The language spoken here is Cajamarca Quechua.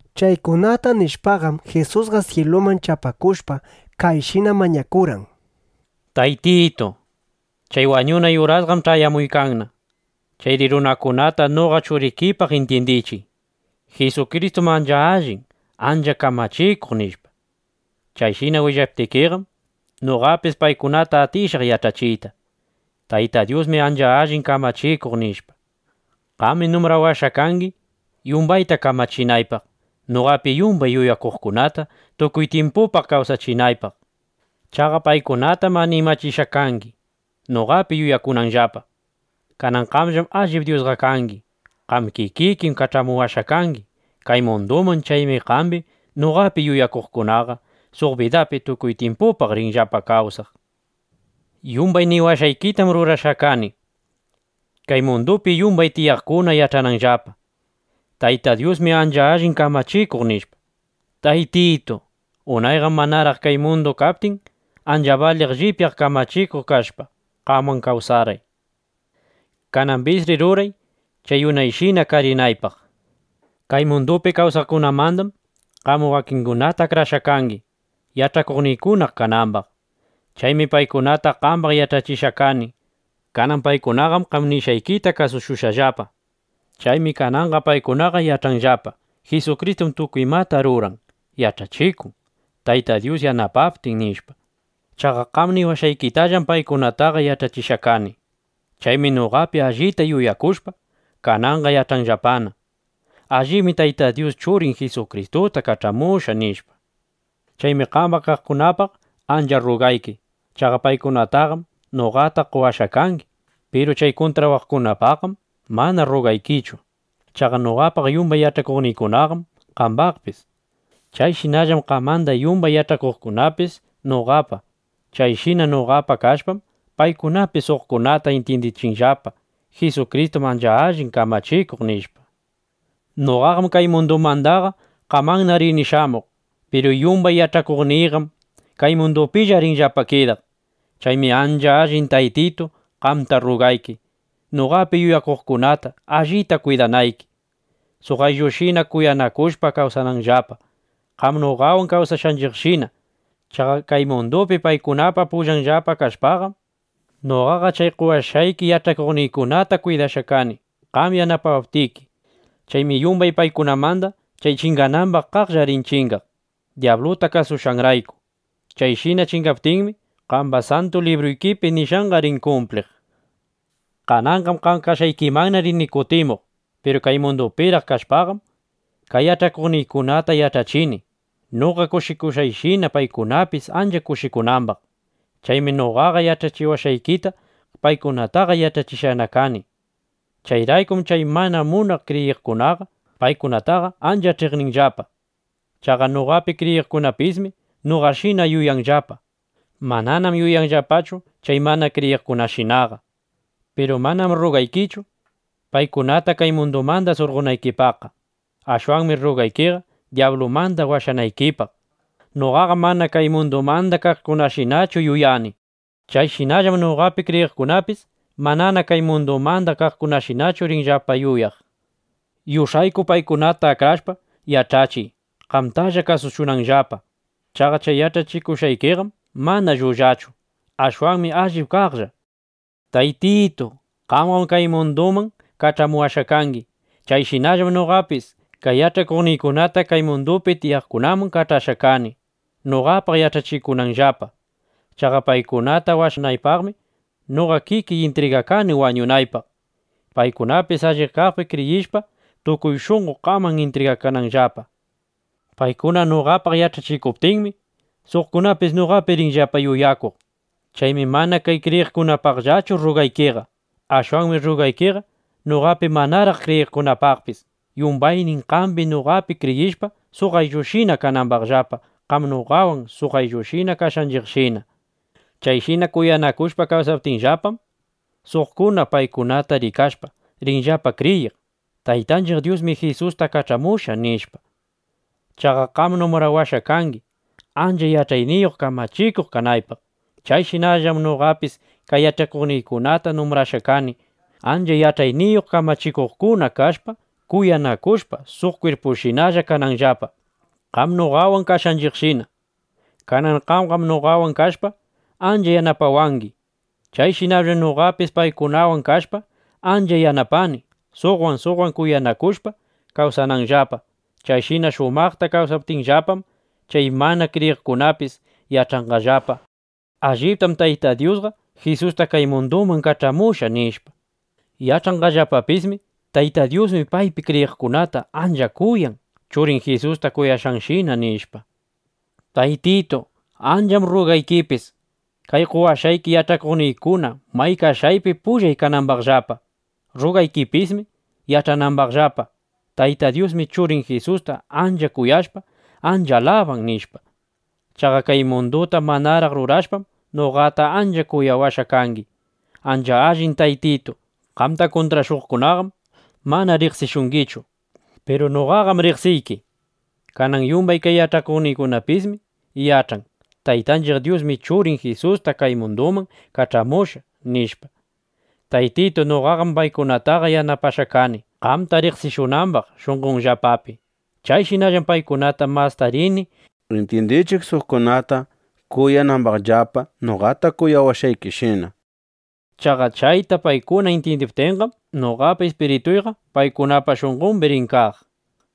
Chaykunata nishpaqam, Jisusqa syiluman chapakushpa, kayshina mañakurqan: —Taytitu, chay wañunay urasqam ch'ayamuykanna. Chayri runakunata noqa Churikipaq intyindichiy: Jisukristum ancha allin ancha kamachikuq, nishpa. Chayshina willaptikiqam, noqapis paykunata atishaq yach'achiyta: Tayta Dyusmi ancha allin kamachikuq, nishpa. Qami numbrawashqa kangi, yumbayta kamachinaypaq, noqapi yumbay yuyakuqkunata tukuy tyimpupaq kawsachinaypaq. Chaqa paykunatam animachishqa kangi, noqapi yuyakunanllapa. Kanan qamllam allip Dyusqa kangi. Qam kikikim kach'amuwashqa kangi kay munduman. Chaymi qambi, noqapi yuyakuqkunaqa suq bidapi tukuy tyimpupaq rinllapa kawsaq. ’Yumbay niwashqaykitam rurashqana kani, kay mundupi yumbay tiyaqkuna yach'ananllapa: Tayta Dyusmi ancha allin kamachikuq, nishpa. Taytitu, unayqam manaraq kay mundu kaptin, ancha baliq llipyaq kamachikuq kashpa, qamwan kawsarqay. Kanambisri ruray, chay unayshina karinaypaq. ’Kay mundupi kawsaqkunamandam qam wakingunata akrashqa kangi, yach'akuqniykuna kanambaq. Chaymi paykunata qambaq yach'achishqa kani. Kanan paykunaqam qam nishqaykita kasushqallapa. Chaymi kananqa paykunaqa yach'anllapa: Jisukristum tukuy imata ruran, yach'achikun, Tayta Dyus yanapaptin, nishpa. Chaqa qam niwashqaykitallam paykunataqa yach'achishqa kani. Chaymi noqapi allita yuyakushpa, kananqa yach'anllapana: Allibmi Tayta Dyus Churin Jisukristuta kach'amushqa, nishpa. ’Chaymi qamba kaqkunapaq ancha rrugayki. Chaqa paykunataqam noqata qowashqa kangi. Piru chay kuntrashuqkunapaqqam mana rrugaykichu. Chaqa noqapa yumbay yach'akuqniykunaqam qambapis. Chayshinallam qamanda yumbay yach'akuqkunapis noqapa. Chayshina noqapa kashpam, paykunapis suqkunata intyindichinllapa: Jisukristum ancha allin kamachikuq, nishpa. ’Noqaqam kay mundumandaqa qamanna rini shamuq. Piru yumbay yach'akuqniyqam kay mundupilla rinllapa kidaq. Chaymi ancha allin Taytitu, qamta rrugayki noqapi yuyakuqkunata allita kwidanayki, suq ayllushina kuyanakushpa kawsananllapa, qam noqawan kawsashqanchiqshina. Chaqa kay mundupi paykunapa pullanllapa kashpaqam, noqaqa chay qowashqayki yach'akuqniykunata kwidashqa kani, qam yanapawaptiki. Chaymi yumbay paykunamanda chay chinganambaq kaqlla rin chingaq, dyabluta kasushqanrayku. Chayshina chingaptinmi, qamba Santu Libruykipi nishqanqa rin kumpliq. ’Kananqam qam kashqaykimanna rini kutimuq. Piru kay mundupiraq kashpaqam, kay yach'akuqniykunata yach'achini, noqa kushikushqayshina, paykunapis ancha kushikunambaq. Chaymi noqaqa yach'achiwashqaykita paykunataqa yach'achishqana kani. Chayraykum chay mana munaq kriyiqkunaqa paykunataqa ancha ch'iqninllapa. Chaqa noqapi kriyiqkunapismi noqashinana yuyanllapa. Mananam yuyanllapachu chay mana kriyiqkunashinaqa. Piru manam rrugaykichu, paykunata kay mundumanda surqonaykipaqqa. Ashwanmi rrugaykiqa dyablumanda washanaykipaq. Noqaqam mana kay mundumanda kaqkunashinachu yuyani. Chayshinallam noqapi kriyiqkunapis manana kay mundumanda kaqkunashinachu rinllapa yuyaq. Yush'ayku paykunata akrashpa yach'achiy, qamtalla kasushunanllapa. Chaqa chay yach'achikushqaykiqam mana llullachu. Ashwanmi allip kaqlla. Taytitu, qamqam kay munduman kach'amuwashqa kangi. Chayshinallam noqapis kay yach'akuqniykunata kay mundupi tiyaqkunaman kach'ashqa kani, noqapaq yach'achikunanllapa. Chaqa paykunata washanaypaqmi noqa kikiy intrigakani wañunaypaq, paykunapis allip kaqpi kriyishpa, tukuy shunqo qaman intrigakananllapa. ’Paykuna noqapaq yach'achikuptinmi, suqkunapis noqapi rinllapa yuyakuq. Chaymi mana kay kriyiqkunapaqllachu rrugaykiqa. Ashwanmi rruqaykiqa noqapi manaraq kriyiqkunapaqpis, yumbaynin qambi, noqapi kriyishpa, suq ayllushina kanambaqllapa, qam noqawan suq ayllushina kashqanchiqshina. Chayshina kuyanakushpa kawsaptinllapam, suqkuna paykunata rikashpa, rinllapa kriyiq: Taytanchiq Dyusmi Jisusta kach'amushqa, nishpa. Chaqa qam numbrawashqa kangi, ancha yach'ayniyuq kamachikuq kanaypaq. Chayshinallam noqapis kay yach'akuqniykunata numbrashqa kani, ancha yach'ayniyuq kamachikuqkuna kashpa, kuyanakushpa, suq kwirpushinalla kananllapa, qam noqawan kashqanchiqshina. Kanan qamqam noqawan kashpa, ancha yanapawangi. Chayshinallam noqapis paykunawan kashpa, ancha yanapani, suqwan suqwan kuyanakushpa kawsananllapa. Chayshina shumaqta kawsaptinllapam, chay mana kriyiqkunapis yach'anqallapa: Alliptam Tayta Dyusqa Jisusta kay munduman kach'amushqa, nishpa. Yach'anqallapapismi: Tayta Dyusmi paypi kriyiqkunata ancha kuyan, Churin Jisusta kuyashqanshina, nishpa. ’Taytitu, ancham rruqaykipis, kay qowashqayki yach'akuqniykuna may kashqaypi, pullay kanambaqllapa. Rrugaykipismi yach'anambaqllapa: Tayta Dyusmi Churin Jisusta ancha kuyashpa, ancha alaban, nishpa. Chaqa kay munduta manaraq rurashpam, noqata ancha kuyawashqa kangi. Ancha allin Taytitu, qamta kuntrashuqkunaqam mana riqsishungichu. Piru noqaqam riqsiyki. Kanan yumbay kay yach'akuqniypismi yach'an: Taytanchiq Dyusmi Churin Jisusta kay munduman kach'amushqa, nishpa. Taytitu, noqam paykunataqa yanapashqa kani, qamta riqsishunambaq shunqonllapapi. Chayshinallam paykunata masta rini intyindichiq, suqkunata kuyanambaqllapa, noqata kuyawashqaykishina. Chaqa chayta paykuna intyindiptinqam, noqapa ispirituyqa paykunapa shunqombi rin kaq, nishpa.